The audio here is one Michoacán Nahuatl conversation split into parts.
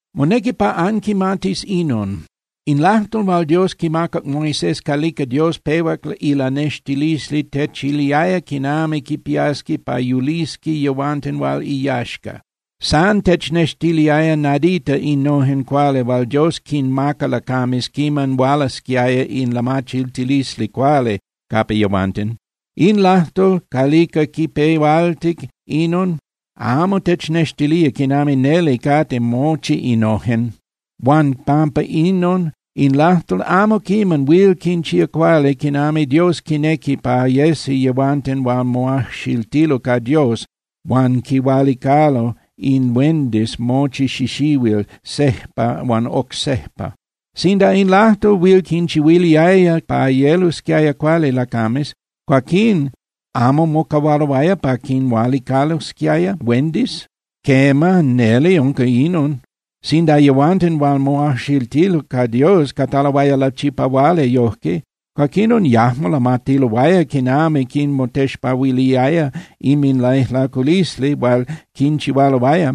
Monequi pa anquimatis inon: In lajtol hual Dios quimacac Moisés calica Dios pehuac ilanextilisli techiliaya quinami quipiasqui pa yulisqui yehuanten hual iyaxca. San technextiliaya nadita innojen cuali hual Dios quinmaca lacames quiman hualasquiaya in lamachiltilisli cuali capa yehuanten. In lajtol calica quipehualtic inon amo technextilía quinami neli cate mochi innojen. Huan pampa inon in lajtol amo quiman huil quinchía cuali quinami Dios quinequi pa yesi yehuanten hual moajxiltilo ca Dios huan quinhualicalo in huendis mochi xixihuil, sejpa huan oc sejpa. Sinda in lajtol huil quinchihuiliaya pa yelosquiaya cuali lacames, cuaquín ¿amo mocahualoaya pa quinhualicalosquiaya huendis? Quema, neli unca inon. Sinda yehuanten hual moajxiltilo ca Dios cataloaya lachipahuali yojque, cuaquinon yajmo lamatiloaya quinami quinmotexpahuiliaya inminlaijlaculisli hual quinchihualoaya.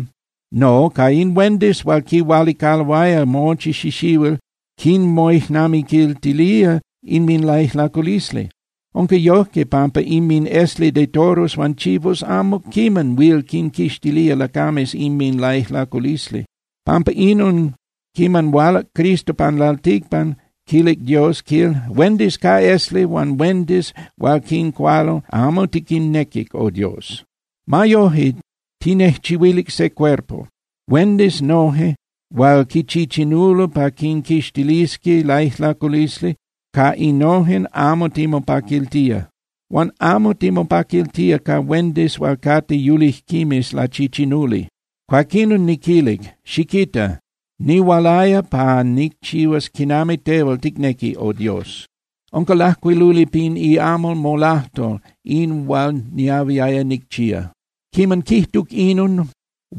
No, ca in huendis hual quinhualicaloaya mochi xixihuil, quinmoijnamiquiltilía inminlaijlaculisli. Unca yojque pampa inminesli de toros huan chivos amo quiman huil quinquixtilía lacames inminlaijlaculisli. Pampa inon, quiman hualac Cristo pan lalticpan, quilic Dios, quil: Huendis ca esli huan huendis hual quincualo amo tiquinnequic, Oh Dios. Ma yoje, tinejchihuilic se cuerpo. Huendis noje hual quichichinulo pa quinquixtilisqui laijlaculisli, ca innojen amo timopaquiltía, huan amo timopaquiltía ca huendis hual cate yulijquimes lachichinuli. Cuaquinon niquilic: “Xiquita, nihualaya pa nicchihuas quinami tehual ticnequi, oh Dios. Unca lajcuiluli pin iamal molajtol in hual niahuiaya nicchía.” Quiman quijtuc inon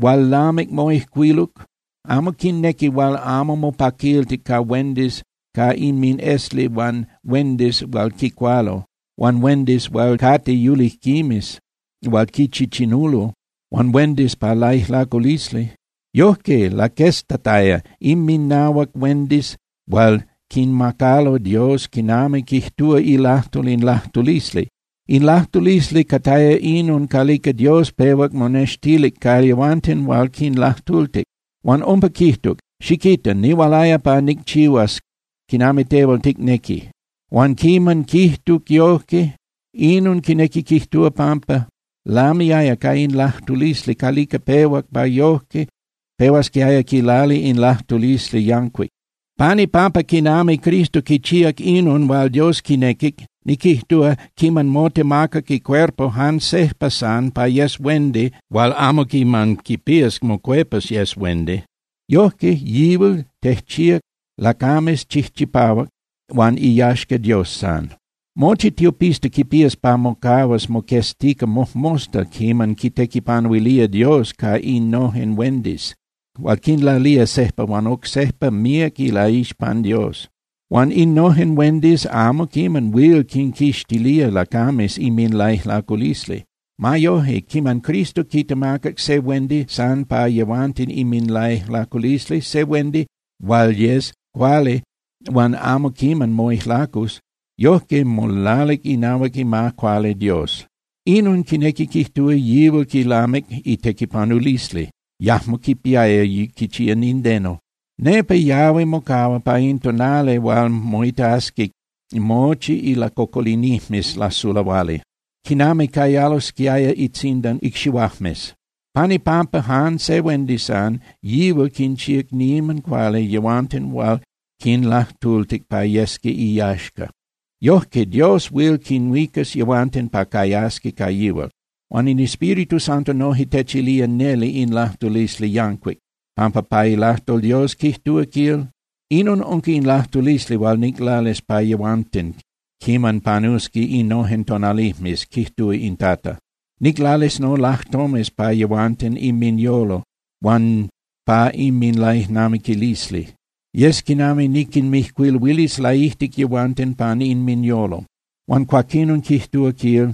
hual lamic moijcuiluc, amo quinnequic huan amo mopaquiltic ca huendis ca inminesli huan huendis hual quicualo, huan huendis hual cate yulijquimes hual quichichinulo, huan huendis pa laijlaculisli. Yojque laqueztataya inminahuac huendis hual quinmacalo Dios quinami quijtúa ilajtol in lajtulisli. In lajtulisli cataya inon calica Dios pehuac monextilic ca yehuanten hual quinlajtultic. Huan umpa quijtuc: “Xiquita, nihualaya pa nicchihuas quinami tehual ticnequi.” Huan quiman quijtuc yojque, inon quinequi quijtúa pampa lamiaya ca in lajtulisli calica pehuac pa yojque pehuasquiaya quilali in lajtulisli yancuic. Pan ipampa quinami Cristo quichíac inon hual Dios quinequic, niquijtúa, quiman motemacac icuerpo jan sejpa san pa yes huendi hual amo quiman quipías mocuepas yes huendi, yojque yihual tejchíac lacames chijchipahuac huan iyaxca Dios san. Mochi tiopista quipías pa mocahuas moqueztica mojmosta quiman quitequipanuilía Dios ca innojen huendis hual quinlalía sejpa huan oc sejpa míac ilaixpan Dios. Huan innojen huendis amo quiman huil quinquixtilía lacames inminlaijlaculisli. Ma yoje, quiman Cristo quitemacac se huendi san pa yehuanten inminlaijlaculisli, se huendi hual yes cuali huan amo quiman moijlacus, yojque molalic inahuac ima cuali Dios. Inon quinequi quijtúa yihual quilamic itequipanulisli, yajmo quipiaya quichía nindeno. Nepa yahui mocahua pa in tonali hual moitasqui mochi ilacocolinijmes lasulahuali, quinami cayalosquiaya itzindan icxihuajmes. Pan ipampa jan se huendi san, yihual quinchíac niman cuali yehuanten hual quinlajtultic pa yesqui iyaxca. Yojque Dios huil quinhuicas yehuanten pa cayasqui ca yihual. Huan in Espíritu Santo noje techilía neli in lajtulisli yancuic, pampa pa ilajtol Dios quijtúa quil: Inon unca in lajtulisli hual niclalis pa yehuanten quiman panusqui innojen tonalijmes, quijtúa in Tata: Niclalis nolajtomes pa yehuanten inminyolo huan pa inminlaijnamiquilisli. Yes quinami niquinmijcuiluilis laijtic yehuanten pan inminyolo. Huan cuaquinon quijtúa, quil: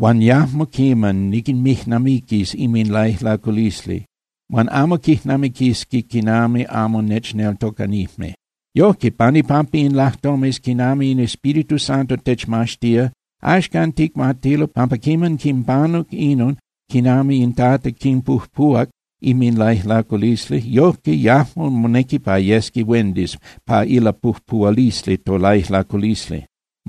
Huan yajmo quiman niquinmijnamiquis inminlaijlaculisli, huan amo quijnamiquisqui quinami amo nechneltocanijme. Yojque pan ipampa in lajtomes, quinami in Espíritu Santo techmaxtía, axcan ticmatilo pampa quiman quinpanuc inon quinami in Tata quinpujpuhuac inminlaijlaculisli, yojque yajmo monequi pa yesqui huendis pa ilapujpuhualisli tolaijlaculisli.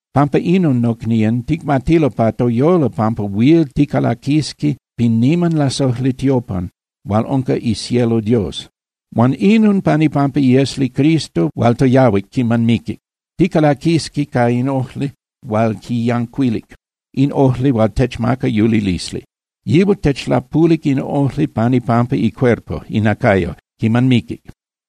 Pampa inon, nocnían, ticmatilo pa toyolo pampa huil ticalaquisqui pin niman lasojli tiopan hual unca icielo Dios, huan inon pan ipampa iesli Cristo hual toyahuic quiman miquic. Ticalaquisqui ca in ojli hual quiyancuilic, in ojli hual techmaca yulilisli. Yihual techlapulic in ojli pan ipampa icuerpo (inacayo) quiman miquic.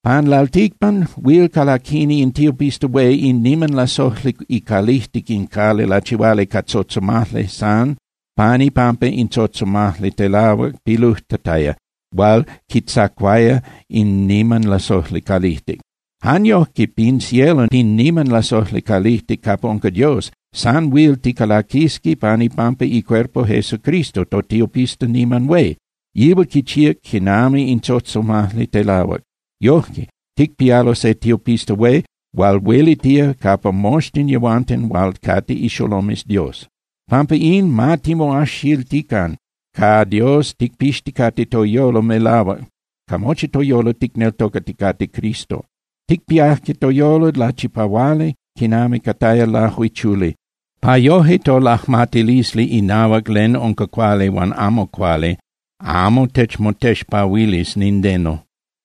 Pan lalticpan huil calaquini in tiopista hué in niman lasojli icalijtic in cali lachihuali ca tzotzomajli san pan ipampa in tzotzomajli telahuac pilujtataya hual quitzacuaya in niman lasojli calijtic. Jan yojque pin cielo pin niman lasojli calijtic capa unca Dios, san huil ticalaquisqui pan ipampa icuerpo Cristo totiopista niman hué. Yihual quichía quinami in tzotzomajli telahuac. Yojque, ticpialo se tiopista hué hual huelitía capa moxtin yehuanten hual cate ixolomes Dios. Pampa in, ma timoajxiltican ca Dios ticpixticate toyolo melahuac ca mochi toyolo ticneltocaticate Cristo. Ticpiajque toyolo lachipahuali quinami cataya lajuichuli, pa yoje tolajmatilisli inahuac len unca cuali huan amo cuali amo techmotexpahuilis nindeno.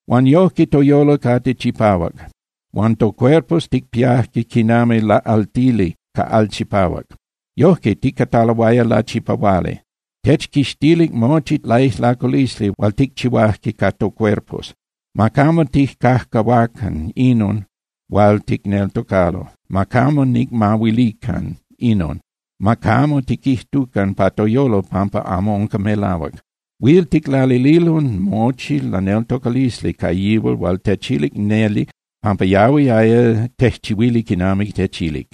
Huan yojque toyolo cate chipahuac. Huan tocuerpos ticpiajque quinami laꞌaltili ca al chipahuac. Yojque ticataloaya lachipahuali, techquixtilic mochi laijlaculisli hual ticchihuaque ca tocuerpos. Ma camo tijcajcahuacan inon hual ticneltocalo. Ma camo ticmahuilican inon, ma camo tiquijtucan pa toyolo pampa amo unca melahuac. Huil ticlalililo mochi laneltocalisli ca yihual hual techilic neli pampa yahuiaya tejchihuili quinami techilic.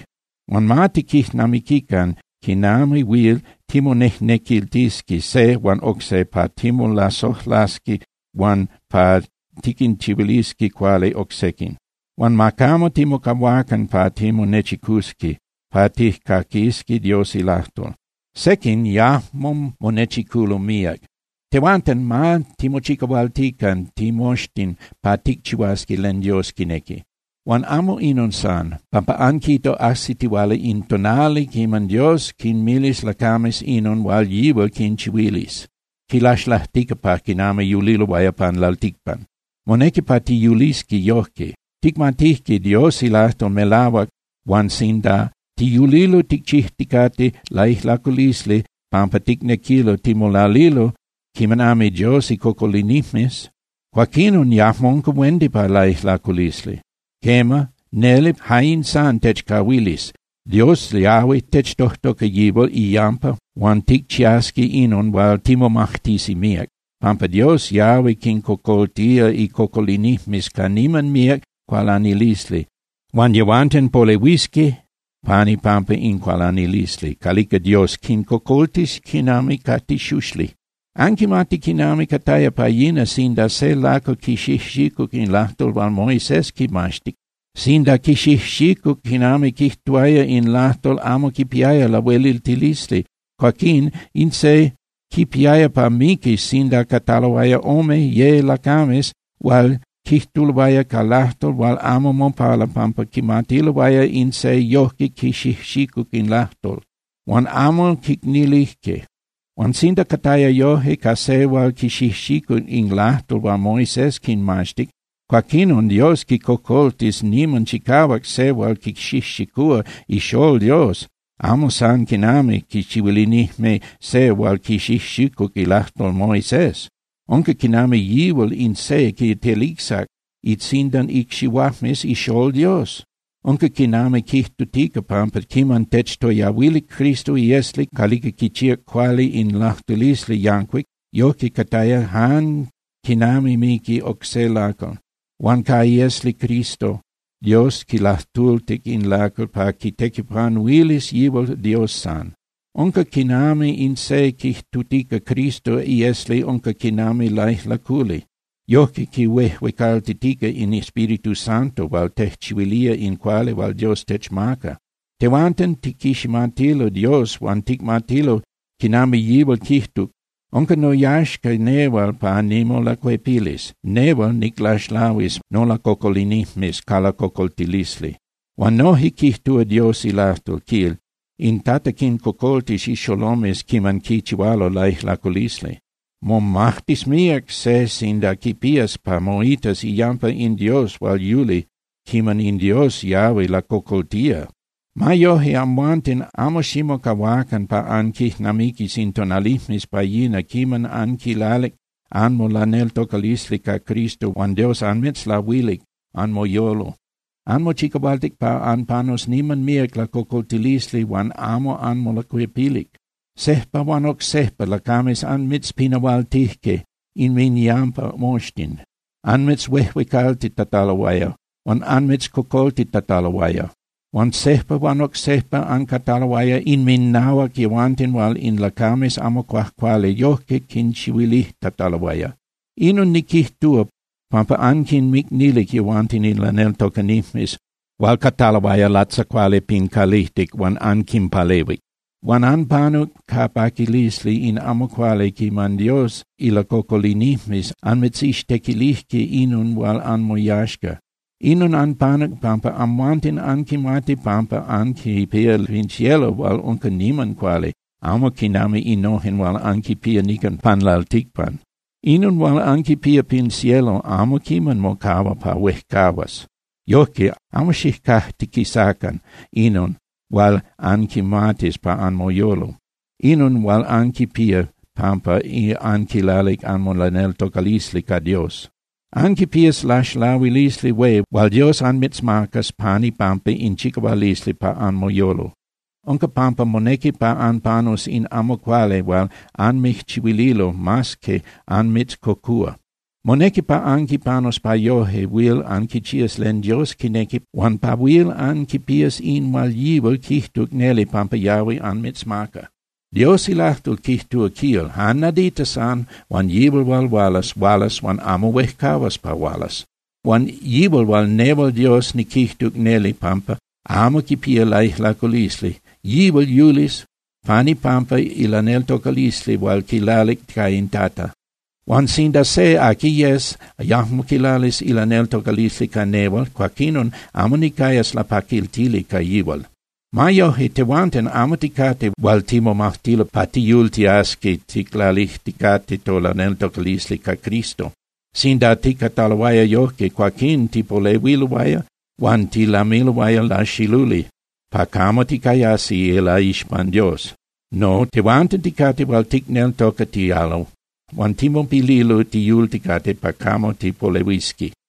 Huan ma tiquijnamiquican quinami huil timonejnequiltisqui se huan oc se pa timolasojlasqui huan pa tiquinchihuilisqui cuali oc sequin. Huan ma camo timocahuacan pa timonechicusqui pa tijcaquisqui Dios ilajtol. Sequin yajmo monechiculo míac. Tehuanten ma timochicahualtican timoxtin pa ticchihuasqui len Dios quinequi. Huan amo inon san, pampa anquita ajsitihuala in tonali quiman Dios quinmilis lacames inon hual yihual quinchihuilis, quinlaxlajtica pa quinami yuliloaya pan lalticpan. Monequi pa tiyulisqui yojque. Ticmatijque Dios ilajtol melahuac huan sinda tiyulilo ticchijticate laijlaculisli pampa ticnequilo timolalilo quinami Dios icocolinijmes, cuaquinon yajmo unca huendi pa laijlaculisli. Quema, neli ja in san techcahuilis: Dios yahui techtojtoca yihual iyampa huan ticchiasqui inon huan timomajtisi míac, pampa Dios yahui quincocoltía icocolinijmes ca niman míac cualanilisli huan yehuanten polehuisqui pan ipampa in cualanilisli calica Dios quincocoltis quinami ca tixuxli. Anquimati quinami cataya pa yina sinda se lacal quixijxicuc in lajtol hual Moisés quimaxtic. Sinda quixijxicuc quinami quijtuaya in lajtol amo quipiaya lahueliltilisli, cuaquín in se quipiaya pa miquis sinda cataloaya ome, ye lacames hual quijtuloaya ca lajtol hual amo mopala pampa quimatiloaya in se yojque quixijxicuc in lajtol. Huan amo quicnilijque. Huan sinda cataya yojque ca se hual quixijxicuc in lajtol hual Moisés quinmaxtic, cuaquinon Dios quicojcocoltis niman chicahuac se hual quixijxicúa iXolol Dios, amo san quinami quichihuilinijme se hual quixijxicuc ilajtol Moisés. Unca quinami yihual in se quitelicsac itzindan icxihuajmes iXolol Dios. Unca quinami quijtutica pampa quiman techtoyahuilic Cristo iesli calica quichíac cuali in lajtulisli yancuic, yojque cataya jan quinami miqui oc se lacal. Huan ca iesli Cristo, Dios quilajtultic in lacal pa quitequipanuilis yihual Dios san. Unca quinami in se quijtutica Cristo iesli unca quinami laijlaculi, yojque quihuejuecaltitica in Espíritu Santo hual tejchihuilía in cuali hual Dios techmaca. Tehuanten tiquiximatilo Dios huan ticmatilo quinami yihual quijtuc: “Unca noyaxca nehual pa nimolacuepilis. Nehual niclaxlahuis nolacocolinijmes ca lacocoltilisli.” Huan noje quijtúa Dios ilajtol, quil: “In Tata quincocoltis ixolomes quiman quichihualo laijlaculisli.” ¡Momajtis míac se sinda quipías pa moitas iyampa in Dios hual yuli quiman in Dios yahui lacocoltía! Ma yoje, amhuanten amo ximocahuacan pa anquijnamiquis in tonalijmes pa yina quiman anquilalic anmolaneltocalisli ca Cristo huan Dios anmitzlahuilic anmoyolo. Anmochicahualtic pa anpanus niman míac lacocoltilisli huan amo anmolacuepilic. Sejpa huan oc sejpa lacames anmitzpinahualtijque inminyampa moxtin, anmitzhuejuecaltitataloaya huan anmitzcocoltitataloaya. Huan sejpa huan oc sejpa ancataloaya inminahuac yehuanten hual in lacames amo cuajcuali yojque quinchihuilijtataloaya. Inon niquijtúa, pampa anquinmicnilic yehuanten in laneltocanijmes hual cataloaya latzacuali pin calijtic huan anquinpalehuic. Huan anpanuc ca paquilisli in amo cuali quiman Dios ilacocolinijmes anmitzixtequilijque inon hual anmoyaxca. Inon anpanuc pampa amhuanten anquimati pampa anquipía len pin cielo hual unca niman cuali, amo quinami innojen hual anquipía nican pan lalticpan. Inon hual anquipía pin cielo amo quiman mocahua pa huejcahuas. Yojque, amo xijcajtiquisacan inon hual anquimatis pa anmoyolo, inon hual anquipía pampa anquilalic anmolaneltocalisli ca Dios. Anquipías laxlahuilisli hué hual Dios anmitzmacas pan ipampa in chicahualisli pa anmoyolo. Unca pampa monequi pa anpanus in amo cuali hual anmijchihuililo mas que anmitzcocúa. Monequi pa anquipanus pa yoje huil anquichías len Dios quinequi huan pa huil anquipías in hual yihual quijtuc neli pampa yahui anmitzmaca. Dios ilajtol quijtúa, quil: Jan nadita san huan yihual hual hualas, hualas huan amo huejcahuas pa hualas. Huan yihual hual nehual Dios niquijtuc neli pampa amo quipía laijlaculisli, yihual yulis pan ipampa ilaneltocalisli hual quilalic ca in Tata. Huan sinda se, aqui yes, yajmo quilalis ilaneltocalisli ca nehual, cuaquinon amo nicayas lapaquiltili ca yihual. Ma yoje, tehuanten amo ticate hual timomajtilo pa tiyultiasqui ticlalijticate tolaneltocalisli ca Cristo. Sinda ticataloaya yojque, cuaquín tipolehuiloaya huan tilamiloaya laxiluli pa camo ticayasi ilaixpan Dios. No, tehuanten ticate hual ticneltocatialo huan timopililo tiyulticate pa camo tipolehuisqui.